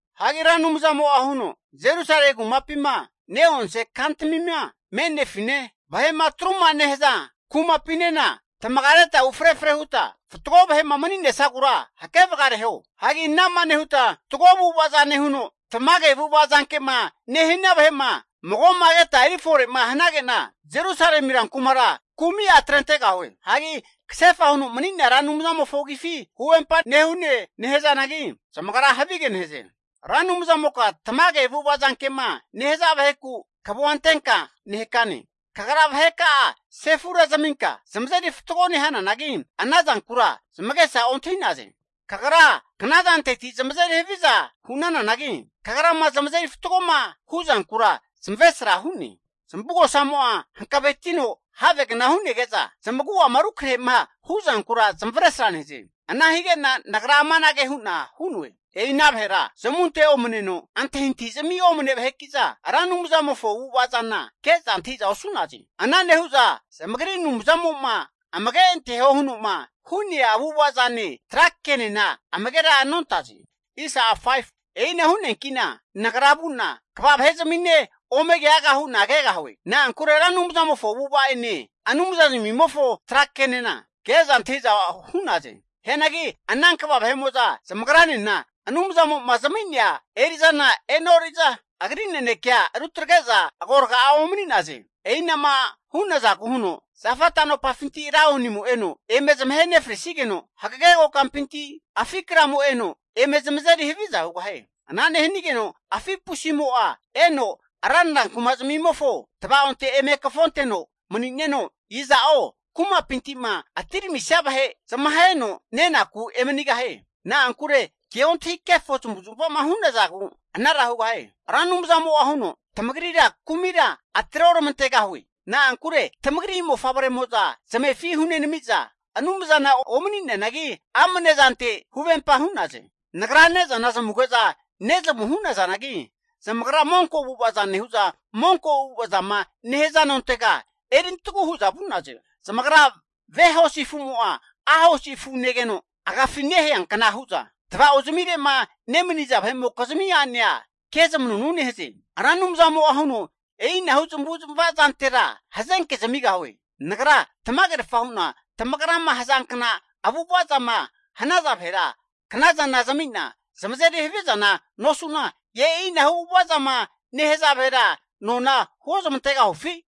Hagi Ra Anumzamo'a huno, Jerusalemi kumapima ne'onse kantamima me'nefine, vahe'ma atruma nehaza kumapinena tamagareta ufre efre huta fatgo vahe'ma mani'nesagura hakevagareho. Hagi ana'ma nehuta fatgo avu'ava'za nehuno tamage avu'ava zanke'ma nehania vahe'ma mago'ma keta eri fore'ma hanage'na, Jerusalemi rankumara kumi'a atrentegahue. Hagi kasefa huno mani'nea Ra Anumzamofo agifi huvempa nehune nehazanagi, zamagra havige nehaze. Ra Anumzamoka tamage avu'ava zanke'ma nehaza vaheku kavua antenka nehakane. Kagra vaheka'a sefura zaminka zamazeri fatgo nehananagi ana zankura zamagesa ontahi'naze. Kagra knazanteti zamazeri haviza hu'nananagi, Kagrama zamazeri fatgoma hu'zankura zamavesra hu'ne. Zamavugosamo'a hankavetino havegna hu'nege'za, zamagu'ama rukrahe'ma hu'zankura zamavesra nehaze. Ana hige'na nagra amanage hu'na hu'noe. E'ina vahera zamunte omaneno antahintahizamia omane vaheki'za, Ra Anumzamofo avu'ava zana ke'za antahi'za osu'naze. Ana nehu'za zamagri Anumzamo'ma amage anteho huno'ma hu'nea avu'ava zane tra kenena amagera nontaze. E'ina hu'neanki'na nagra vu'na kva vahezamine ome keaga hu'na kegahue. Na'ankure Ra Anumzamofo avu'avaene Anumzazmimofo tra kenena keza antahiza hu'naze. Hianagi ana kva vahe'mo'za zamagranena Anumzamo'ma zami'nea eri'zana e'nori'za Agri nanekea rutagre'za agorga'a omani'naze. E'ina'ma hu'nazagu huno zafa tanopafinti laonimo eno eme zamahe nefrisigeno, hagage kokampinti afi kramo eno eme zamazeri haviza hugahie. Ana nehanigeno afi pusimo'a eno ranra kumazamimofo tvaonte eme kafo anteno mani'neno, iza'o kumapinti'ma atiramisia vahe zamaheno nenaku emanigahie. Na'ankure keontahi kefo zamavu zamava hu'nazagu anara hugahie. Ra Anumzamo'a huno, tamagrira kumira atre oramantegahue. Na'ankure tamagri mofavremo'za zamefi hunenami'za, anumzana omani'neanagi amne zante huvempa hu'naze. Nagra ne'zana zamuge'za nezamu hu'nazanagi, zamagra monko avu'avaza nehu'za monko avu'ava zama nehaza nontega erintagu hu'za vu'naze. Zamagra ve hosi afu'mo'a a' hosi afu negegeno agafi neheanka hu'za, tava'ozamire'ma nemaniza vahe'mokizmi a'nea ke zamanunu nehaze. Ra Anumzamo'a huno, E'inahu zamavu zamava zantera hazenke zamigahue. Nagra tamagerfa hu'na tamagrama hazankna avu'ava zama hanaza vahera knazana zami'na zamazeri havizana nosu'na, e'inahu avu'ava zama nehaza vahera nona huo zamantegahufi?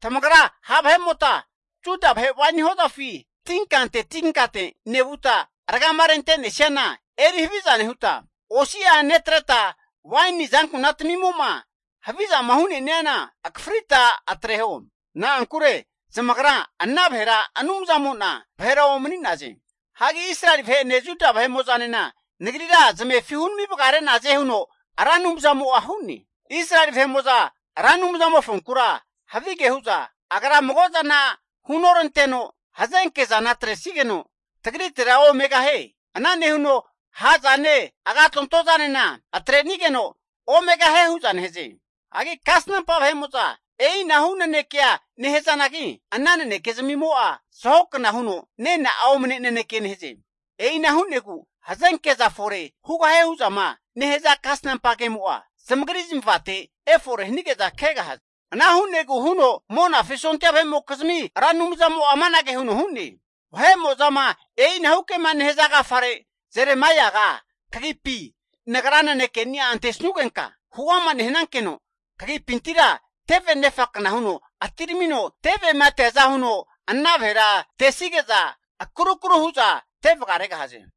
Tamagra ha' vahe'mota Juda vahe waini hozafi tinkante tinkante nevuta ragama rente'nesiana eri haviza nehuta, osi'a netreta waini azankuna tamimo'ma havizama hu'neniana akafrita eri atreho. Na'ankure zamagra ana vahera Ra Anumzamo'na vahera omani'naze. Hagi Israeli vahe'ene Juda vahemo'zanena Nagrira zamefi hunami vagare'naze huno Ra Anumzamo'a hu'ne. Israeli vahe'mo'za Ra Anumzamofonkura havige hu'za, Agra mago zana hunoranteno, hazenke zana atresigeno tagritera omegahie. Ana nehuno ha' zane agatonto zanena atre'nigeno omegahie hu'za nehaze. Hagi kasnampa vahe'mo'za e'inahu naneke nehazanagi ana naneke zamimo'a zahokna huno nena'a omane naneke nehaze. E'ina hu'negu hazenke'za fore hugahie hu'zama nehaza kasnampa kemo'a zamagri zamavate efore hanige'za kegahaze. Ana hu'negu huno Monafi sondia vahe'mokizmi Ra Anumzamo'a amanage huno hu'ne. Vahemo'zama e'inahu kema nehaza agafare Jeremaiaga kagipi Nagra nanekeni'a antesanugenka huama nehanankeno, kagipintira teve nefakna huno atiramino, tevema teaza huno ana vahera tesige'za akrukru hu'za teveregahaze.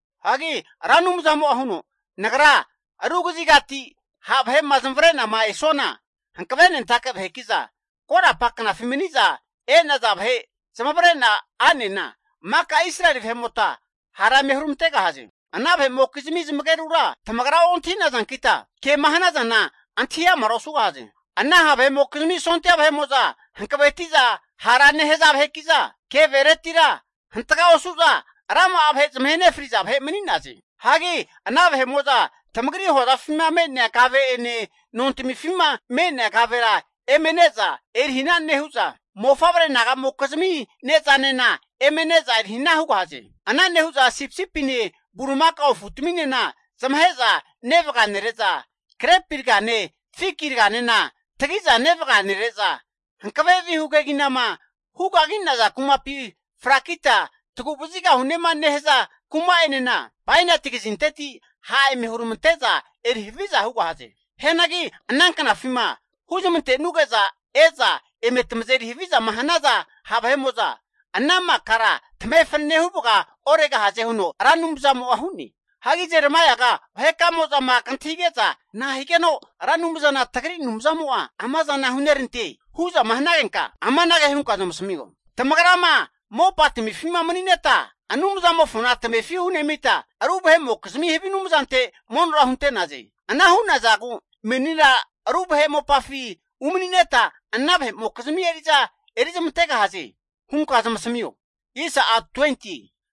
Hagi Ra Anumzamo'a huno, Nagra ru kazigati ha' vahe'ma zamavare'na esuana hankavenentake vaheki'za korapa knafi mani'za e'naza vahe zamavare'na a'nena maka Israeli vahe'mota hara eme huramantegahaze. Ana vahe'mokizmi zamagerura tamagra ontahi nazankita kema hanazana antahi amara osugahaze. Ana ha' vahe'mokizmi sondia vahe'mo'za hankaveti'za hara nehaza vaheki'za, keveretira hantga osu'za rama'a vahe zamahe nefriza vahe mani'naze. Hagi ana vahe'mo'za tamagri hozafima mene'a kave'ene, nontamifima me'nea kavera eme ne'za eri hana nehu'za, mofavre naga'mokizmi ne'zanena eme ne'za eri hana hugahaze. Ana nehu'za sipisipine bulimakao afutaminena zamahe'za nevaga nere'za, grepi ragane fiki raganena tagi'za nevaga nere'za, hankave vihu keginama hu kagi'naza kumapi frakita tagu vazigahunema nehaza kuma'enena bainati kazinteti ha' eme huramante'za eri haviza hugahaze. Hianagi ana knafima huzamantenuge'za e'za eme tamazeri havizama hanaza ha' vahe'mo'za, ana makara tamahe fanane huvaga oregahaze huno Ra Anumzamo'a hu'ne. Hagi Jeremaiaga vahe kamo'zama kantahige'za, nahigeno Ra Anumzana tagri Anumzamo'a amazana hunerante? hu'zama hanagenka amanage hunka zamasamio. Tamagrama mopatamifima mani'neta Anumzamofona tamefi hunemita, ru vahe'mokizmi havi anumzante monora hunte'naze. Ana hu'nazagu menina ru vahe mopafi umani'neta ana vahe'mokizmi eri'za eri zamantegahaze hunka zamasamio.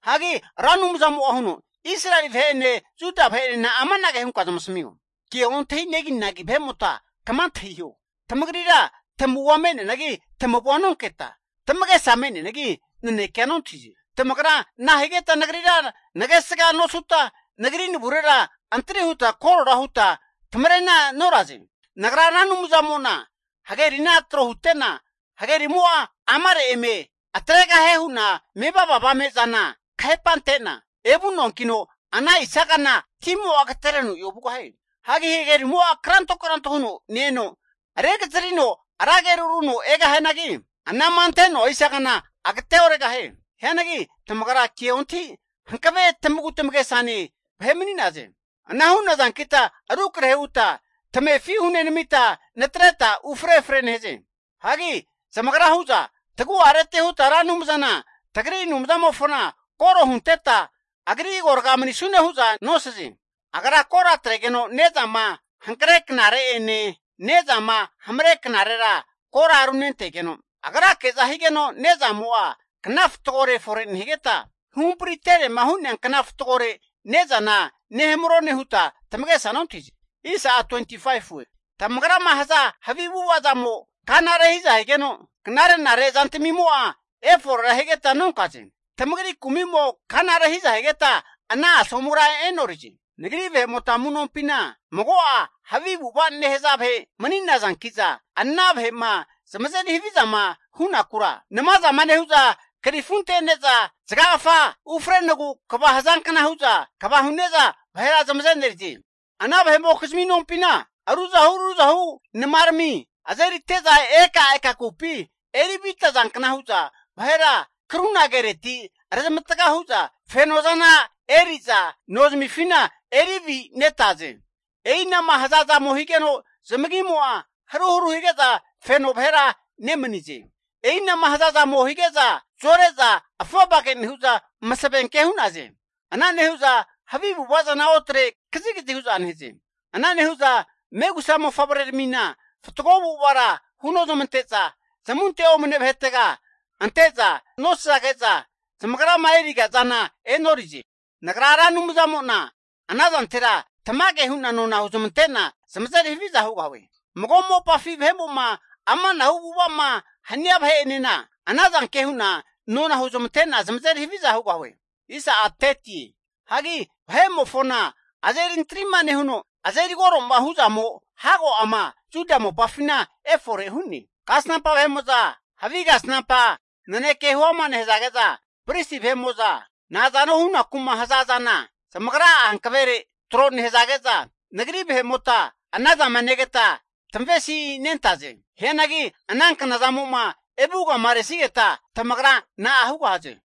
Hagi Ra Anumzamo'a huno, Israeli vahe'ene Juda vahe'enena amanage hunka zamasamio. Kea ontahi neginagi vahe'mota kama antahiho. Tamagrira tamavua me'neanagi tamavua nonketa, tamagesa me'neanagi nanekea nontahize. Tamagra nahigeta Nagrira nagesga nosuta, Nagri navurera antri nehuta korora huta tamarena noraze. Nagra Ra Anumzamo'na hagerina tro hute'na, hagerimo'a amare eme tregahie hu'na mevava avame zana kahepa ante'na, evu'noankino ana isagana timo'a agatereno ovugahie. Hagi hagerimo'a kranto kranto huno ne-eno rekazarino ra ageru runo egahianagi, anama ante'noa isagana agate oregahie. Hianagi tamagra keontahita hankave tamagu tamagesane vahe mani'naze. Ana hu'nazankita rukrahe huta tamefi hunenamita natreta ufre efre nehaze. Hagi zamagra hu'za, tagu'areti huta Ra Anumzana tagri Anumzamofona koro hunteta agri agorga manisune huza nosaze. Agra kora atregeno ne'zama hankre knare'ene, ne'zama hamre knarera kora runentegeno, Agrake'za higeno ne'zamo'a kna fatgore fore nehigeta, huhampari terema hu'nea kna fatgore ne'zana nehamarone huta tamagesa nontahize. Tamagrama haza havi avu'ava zamo kana rehiza higeno, knare'nare zantamimo'a eforera higeta nonkaze. Tamagri kumi'mo kana rehiza higeta ana asomura e'norize. Nagri vahe'mota amu'nompina mago'a havi avu'ava nehaza vahe mani nazanki'za ana, vahe'ma zamazeri havizama hunakura, namazama nehu'za krifu ante'neza zaga kfa ufrenogu kva hazankna hu'za kva hune'za vahera zamazenerize. Ana vahe'mokizmi nompina ruzahu ruzahu namarami azerite'za ekaeka kupi erivita zankna hu'za, vahera karuna kereti rezamatga hu'za fenozana eri'za, nozamifina eri avinetaze. E'ina'ma haza zamo higeno zamagimo'a haruharu hige'za feno vahera nemanize. E'ina'ma hazazamo hige'za zore'za afovage nehu'za, masavenke hu'naze. Ana nehuza havi avu'ava zana otre kazigazi hu'za nehaze. Ana nehu'za megusa mofavreramina fatgo avu'avara hunozamante'za, zamunte omane vahetega ante'za zamaza nosazage'za zamagrama eriga zana e'norize. Nagra Ra Anumzamo'na anazantera tamage hu'na nona huzmante'na zamazeri haviza hugahue. Mago mopafi vahemo'ma amanahu avu'ava'ma hania vahe'enena, ana zanke hu'na nona huzmante'na zamazeri haviza hugahue. Hagi vahe'mofona azeri antrima nehuno azeri koroma hu'zamo hago ama Juda mopafina efore hu'ne. Kasnampa vahe'mo'za havi kasnampa naneke huama nehazage'za, pristi vahe'mo'za nazano hunaku'ma haza zana zamagra'a hankavere tro nehazage'za, Nagri vahe'mota ana avu'avaza zama negeta tavesinentaze. Hianagi ana knazamo'ma evu vagamaresigeta tamagra na'a hugahaze?